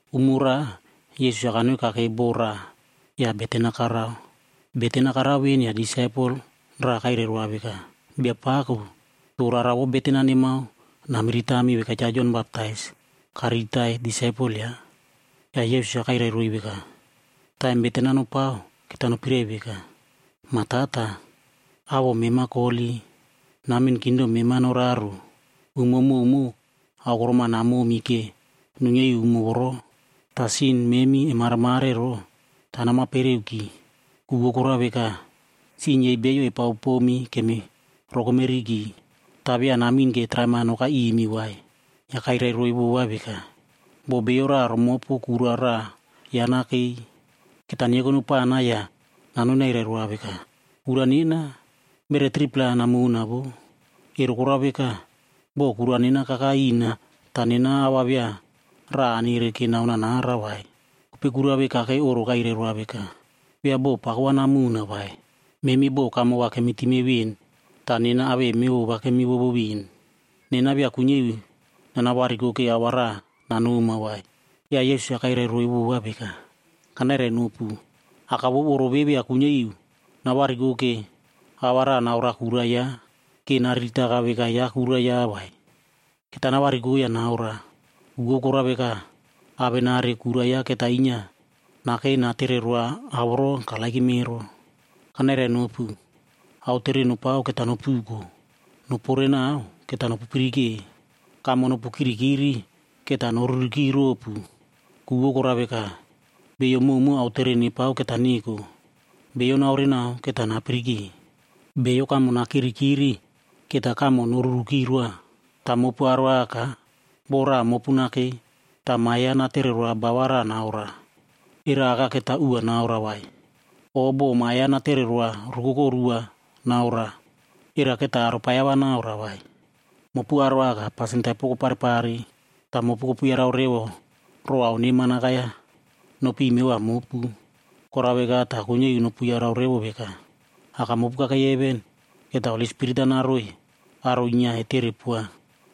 Umo raꞌa Yesus-a kanoi kakei boko raꞌa ya beten-a karao. Beten-a karao ven ya disaipel raꞌa kairai roa veka, “Biapako, to rara vou beten-a nemao namiritami veka Cha Jon Baptais kariritai disaipel yaꞌa.” Ya Yesus-a kairai roiy veka, “Taim beten-a nopao, keta nopirai veka, ‘Ma Tata, awoꞌo mema koholi. Namin kingdom mema noraro. Umo mowmow aokorom-a namomi ke nuinyia iu umo voro. Ta sin memi emaremare ero, ta namapereuki, ku vou korao veka, sin yei beiyo epaopomi kemirokomeriki. Ta via namin ke traim-a nokai imi vai.’” Ya kairai roiy vova veka, “Bo bio raꞌa romopu kura raꞌa yaꞌa nakei, keta nyeko nopana ya nanoi nairai roa veka, ‘Kura nena, beret 3-pla namona voꞌo. Ero korao veka, bo kura nena kakai ina ta nena ao va via raꞌa anere ke naonoa nara vai.’ “Kopei kura ve kakei oꞌro kairai roa veka, ‘Via bo pako va namona vai, memi bo kamo va kemitime ven ta nena awei mevova kemivovo ven. Nena via kuinyia iu nanavariko ke ao va raꞌa nanoma vai.’” Ya Yesus-a kairai roiy vova veka, “Kanairainopu, aka vou oꞌro ve via kuinyia iu navariko ke ao va raꞌa naoroa kura yaꞌa, ke nariritaka veka yaꞌa kura yaꞌa vai. Keta navariko ya naoroa, ku vou korao veka, awenari kura yaꞌa keta inyia nakei natere roa ao voro karererow ero. “Kanairainopu, aotere nopao keta nopuko; noporenao keta nopupirike; kamo nopu kirikiri keta noruriki ropu. Ku vou korao veka, beiyo mowmow aotere nepao keta neko; bio naorenao keta napirike; bio kamo nakirikiri keta kamo noruriki roa. “Ta mopu aro aka, bo raꞌa mopu nakei, ta ma yaꞌa natere roa ba va raꞌa naoroa, era aka keta uꞌu va naoroa vai? O bo ma yaꞌa natere roa rukoko ru va naoroa, era keta aropaiyao va naoroa vai? Mopu aro aka pasin taipo koparepare. Ta mopu kopu yarau revo row ao neman akai-ya nopiy mevova mopu. Korao veka ta kuinyia iu nopu yarau revo veka, Aka mopu kakei heven, keta Holi Spirit-a naroiy aro inyia etere poa!”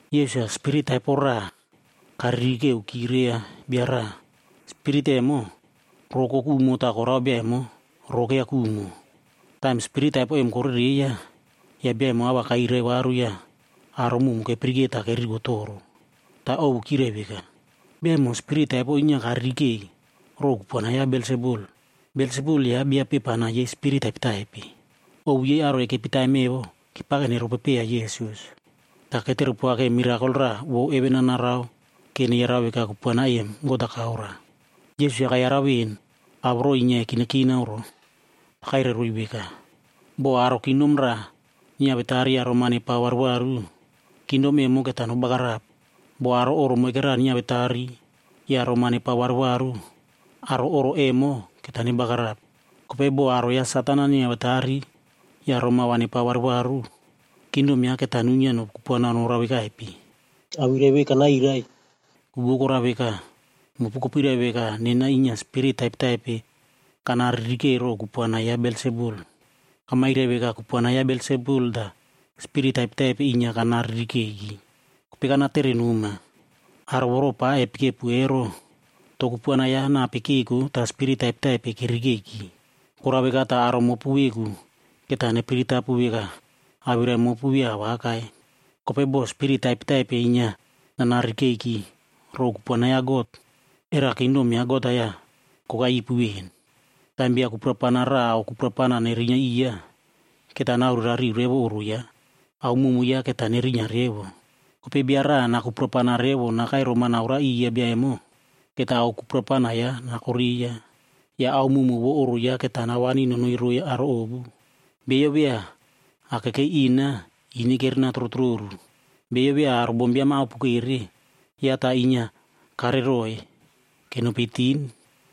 Yesus-a spirit taipo raꞌa karirikeuki reiya bia raꞌa. Spirit emo, roꞌo kokumo ta korao bia emo roꞌo keiya kumo. Taim spirit taipo em korereiya, ya bia emo a va kairai varu ya aro mowmow kepirike ta keririko toro. Ta ovu yei kyirai veka, “Bia emo spirit taipo inyia karirikei row kupuana ya Belsebul.a Belsebul yaꞌa bia pepana yei spirit taipetaipe.” Ovu yei aro ekepi taim evo kepake neropopeiya Yesus, ta ketere poa ke mirakol raꞌa vou heven-a narao ke neyarau veka kupuana em God-a kaoroa. Yesus-a kayarau ven ao voro inyia ekinakinao ro, ta kairai roiy veka, “Bo aro kingdom raꞌa nyiawetari ya roma nepao varuvaru, kingdom emo keta nobagarap. Bo aro oꞌro moikera nyiawetari ya roma nepao varuvaru, aro oꞌro emo keta nebagarap. Kopei bo aro ya Satan-a nyiawetari ya roma va nepao varu varu, kingdom yaꞌa keta nuinyia nokupuana norao vekaipe? Awirai ve kanairai, ku vou korao veka, mopu kopirai veka nena inyia spirit taipetaipe kanaririkeiki row kupuana ya Belsebul. Kamairai veka kupuana ya Belsebul ta spirit taipetaipe inyia kana ririkeiki. Kopei kanatere noma, aro voro pa epikepu ero, to kupuana ya nape keko ta spirit taipetaipe keririkeiki? Korao veka ta aro mopu veku keta nepiritapu veka awirai mopu via awakai. Kopei bo spirit taipetaipe inyia nana ririkeiki row kupuana ya God, ero kingdom ya God-a ya kokai ipu ven. “Taim bia kuprapana raꞌa ao kuprapana nerinyia iya, keta naorerariu revo oꞌro yaꞌa. Ao mowmow yaꞌa keta nerinyia revo. Kopei bia raꞌa nakupuana revo nakai roma naora iya bia emo, keta ao kuprapana yaꞌa nakoreiya. Ya ao mowmow vou oꞌro yaꞌa keta nawani nonoi roiy aro ovu. “Bio via akekei ina, ine kerena trotroru. Bio via aro bombiam-a aopokere, yaꞌa ta inyia kareroiy kenopi tin.”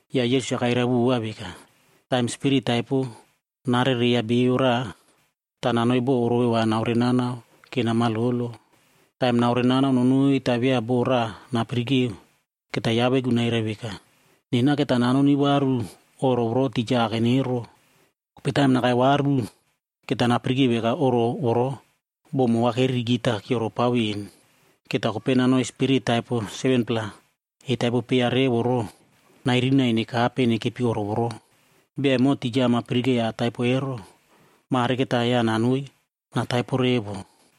Ya Yesus-a kairai vova veka, “Taim spirit taipo narereiya bio raꞌa, ta nanoi bo orove va naorenanao ke namalolo. Taim naorenanao nonoi ta via bo raꞌa napirike, keta yaꞌa veku nairai veka, ‘Nena keta nanoni varu oꞌro voro tija akan ero.’ Kopei taim nakai varu, keta napirike veka oꞌro voro bo mo va keririki ta kyioropao ven. Keta kopei nanoi spirit taipo 7-pla etaipo peiya revo ro, nairinai nekape nekepi oꞌro voro. Bia emo tija ama pirikeiya ataipo ero, mare keta yaꞌa nanoi nataipo revo.”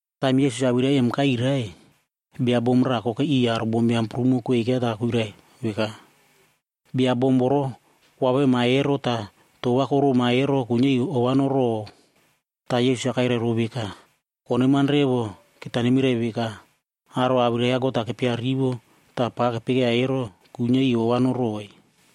Taim Yesus-a awirai em kairai, bia bom raꞌa kokei iꞌiy aro bombiam prumo kweika ta kuirai veka, “Bia bom voro koavema ero ta toꞌo va koroma ero kuinyia iu ova noroꞌow.” Ta Yesus-a kairai row veka, “Koneman revo keta nemirai veka, aro awirai ya God-a kepia rivo ta pa kepekeiya ero, kuinyia iu ova noroꞌoi.”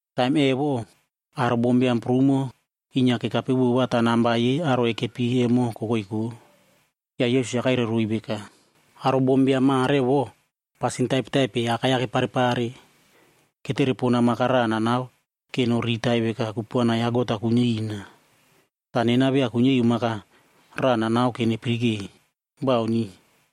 Taim evo, aro bombiam prumo inyia kekape vova ta namba yei aro ekepi emo kokoiko. Ya Yesus-a kairai roiy veka, “Aro bombiam mare voꞌo pasin taipetaipe akai-ya keparepare. Ketere pona mak-a raꞌa nanao ke noriritai veka kupuana ya God-a kuinyia ina. Ta nena via kuinyia iu mak-a raꞌa nanao ke nepirike. Bauni!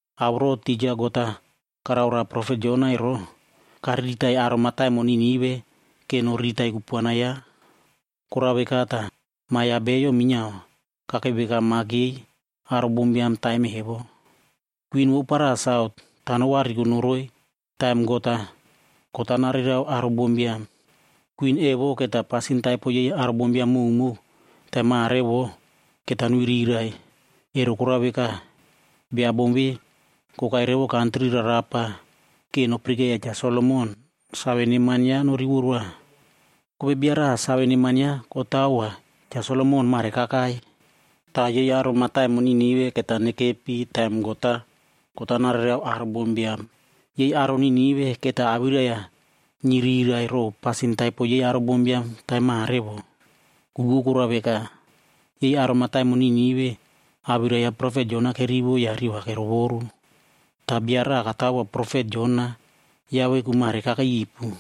Ao voro tija God-a karao roa profet Jona ero, kariritai aro mataimon Ninive ke noriritai kupuana yaꞌa. Korao veka ta, Ma ya Bio minyiao kakei veka mak yei aro bombiam taim evo. Kwin vou para Sautc ta novariko noroi taim God-a, kot-a nareirao aro bombiam. Kwin evo keta pasin taipo yei aro bombiam mowmow taim mare vo keta nuirirai. Ero korao veka, bia bom ve kokai revo kantri rarapa ke nopirikeiya Cha Solomon save neman yaꞌa norivo roa. Kopei bia raꞌa save neman yaꞌa kotawoa Cha Solomon mare kakai. Ta yei aro mataimon Ninive keta nekepi taim God-a, kot-a nareirao aro bombiam. Yei aro Ninive keta awirai-ya nyirirai row pasin taipo yei aro bombiam taim mare voꞌo. Ku vou korao veka, yei aro mataimon Ninive awirai ya profet Jona kerivo ya riꞌi va kerovoru. Ta bia raꞌa katawoa profet Jona yaꞌa veku mare kakei ipu.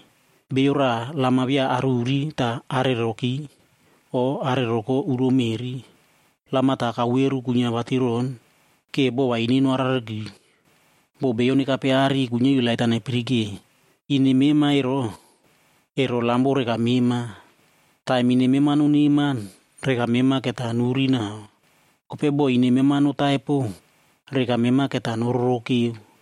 “Beiyo raꞌa lam-a via aruri ta areroki o areroko uro meꞌri. Lam-a ta kauveru kuinyia vatiron ke bo va ine noarareriki. Bo beiyo nekape aꞌari kuinyia iu lait-a nepirike. Ine mema ero, ero lam vou reka mema. Taim ine mema noneman, reka mema keta nuri nau. Kopei bo ine mema notaipo, reka mema keta nororokeu.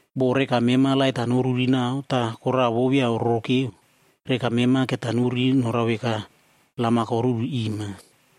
Bo reka mema lait-a noruri nau ta kora vou via ororokeu, reka mema keta noruri norao veka lam-a koruri ima.”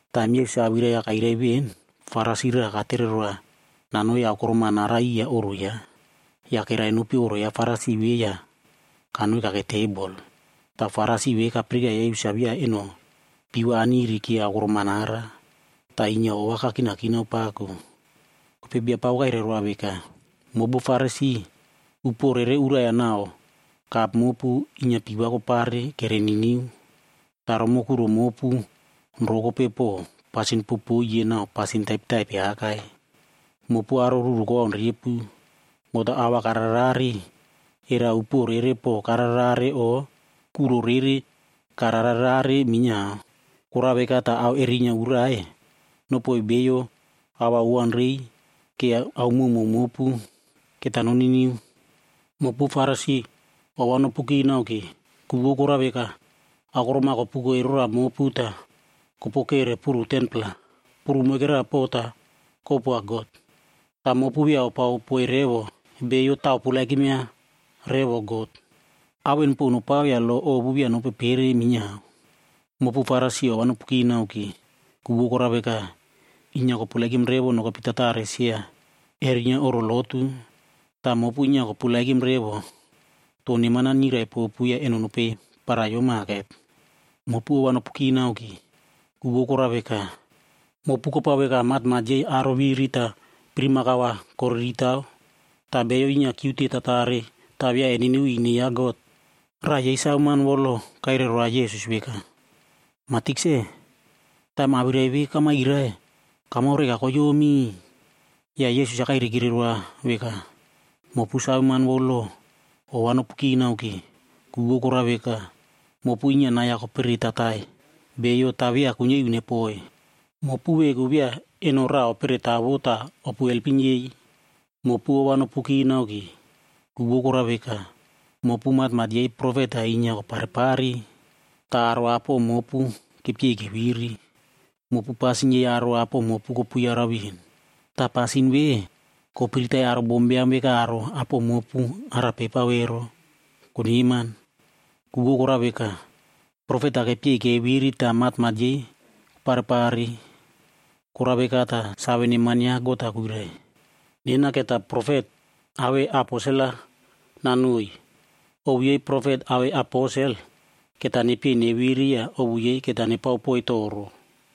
Taim Yesus-a awirai-ya kairai ven, Farisi raꞌa katere roa nanoi aokorom-a nara iya oꞌro yaꞌa. Ya kerai nopi oꞌro ya Farisi ve ya kanoi kakei tebol. Ta Farisi ve kapirikeiya Yesus-a via eno pii va aniri ke aokorom-a nara, ta inyia ova kakinakinao pako. Kopei Biapako kairai roa veka, “Mopu Farisi, upuo rere urai nau kap mopu inyia pii va kopare kere niniu. Ta romoꞌo kuro mopu, rokope po pasin popoiye nau pasin taipetaipe akai. Mopu aro ruru kowaun repu! God-a ao va kararerare, era upuo rere po kararerare o kuro rere kararerare minyiao? Korao veka ta ao erinyia urai, nopoiy beiyo ao owaunrei ke ao mowmow mopu keta noniniu. “Mopu Farisi ova nopu kinao ke! Ku vou korao veka, aokorom-a kopuko erora mopu ta kopokere puru 10-pla. Puru moikera po ta kopoa God. Ta mopu via opao poiy revo beiyo ta operepova revo God. Ao en po nopao ya lo ovu via nopepere minyiao. “Mopu Farisi ova nopu kinao ke! Ku vou korao veka, inyia koperepow revo nokepi tatare sia erinyia oꞌro lotu. Ta mopu inyia koperepoiy revo aro to neman-a nyirai popu ya eno nopei paraiyo maket. “Mopu ova nopu kinao ke! Ku vou korao veka, mopu kopao veka matmat yei aro viri pirimakao va koriritao ta beiyo inyia kyiute tatared ta via eniniu iu ine ya God.” Raꞌa yei saveman vou lo kairai roa Yesus veka, “Ma Tikse, taim awirai ve kamairai, kamao reka koyomi.” Ya Yesus-a kairaikire roa veka, “Mopu saveman vou lo, ova nopu kinao ke! Ku vou korao veka, mopu inyia nai-ya koperetatai beiyo ta via kuinyia iu nepoi. Mopu veku via eno raꞌa operetaovo ta opu elpim yei. “Mopu ova nopu kinao ke! Ku vou korao veka, mopu matmat yei profet-a inyia koparepare. Ta aro apo mopu kepyei keviri. Mopu pasin yei aro apo mopu kopu yarau ven. Ta pasin ve kopiritai aro bombiam veka aro apo mopu arape epao ero, koneman. Ku vou korao veka, profet-a kepyei keviri ta matmat yei koparepare. Korao veka ta, save neman ya God-a kuirai, ‘Nena keta profet awei aposel-a nanoiy. Ovu yei profet awei aposel keta nepyei neviri ya ovu yei keta nepao poiy toro.’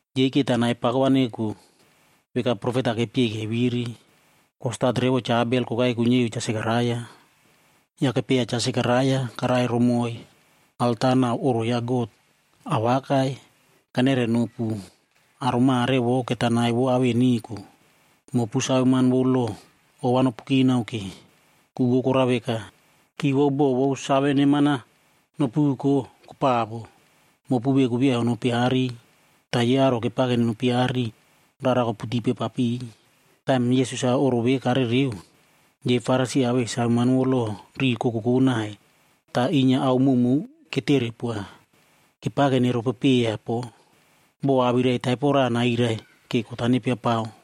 Yei keta nai pako va neko veka profet-a kepyei keviri, kostat revo Cha Abel kokai kuinyia iu Cha Sekaraia. Ya kepyeiya Cha Sekaraia karai romoiy alta nau oꞌro ya God. Awakai, kanairai nopu. Aro mare voꞌo keta nai vou ao en neko. “Mopu saveman vou lo, ova nopu kinao ke! Ku vou korao veka, ki vou bo vou save neman-a nopuko kopavo. Mopu veku via onopi aꞌari ta yei aro kepake nenopi aꞌari, rara koputipe papiy.” Taim Yesus-a oꞌro ve karereo, yei Farisi awei saveman vou lo riꞌi kokokoꞌ nai ta inyia ao mowmow ketere poa. Kepake neropopeiya po, bo awirai taipo raꞌa nairai ke kot-a nepiapao.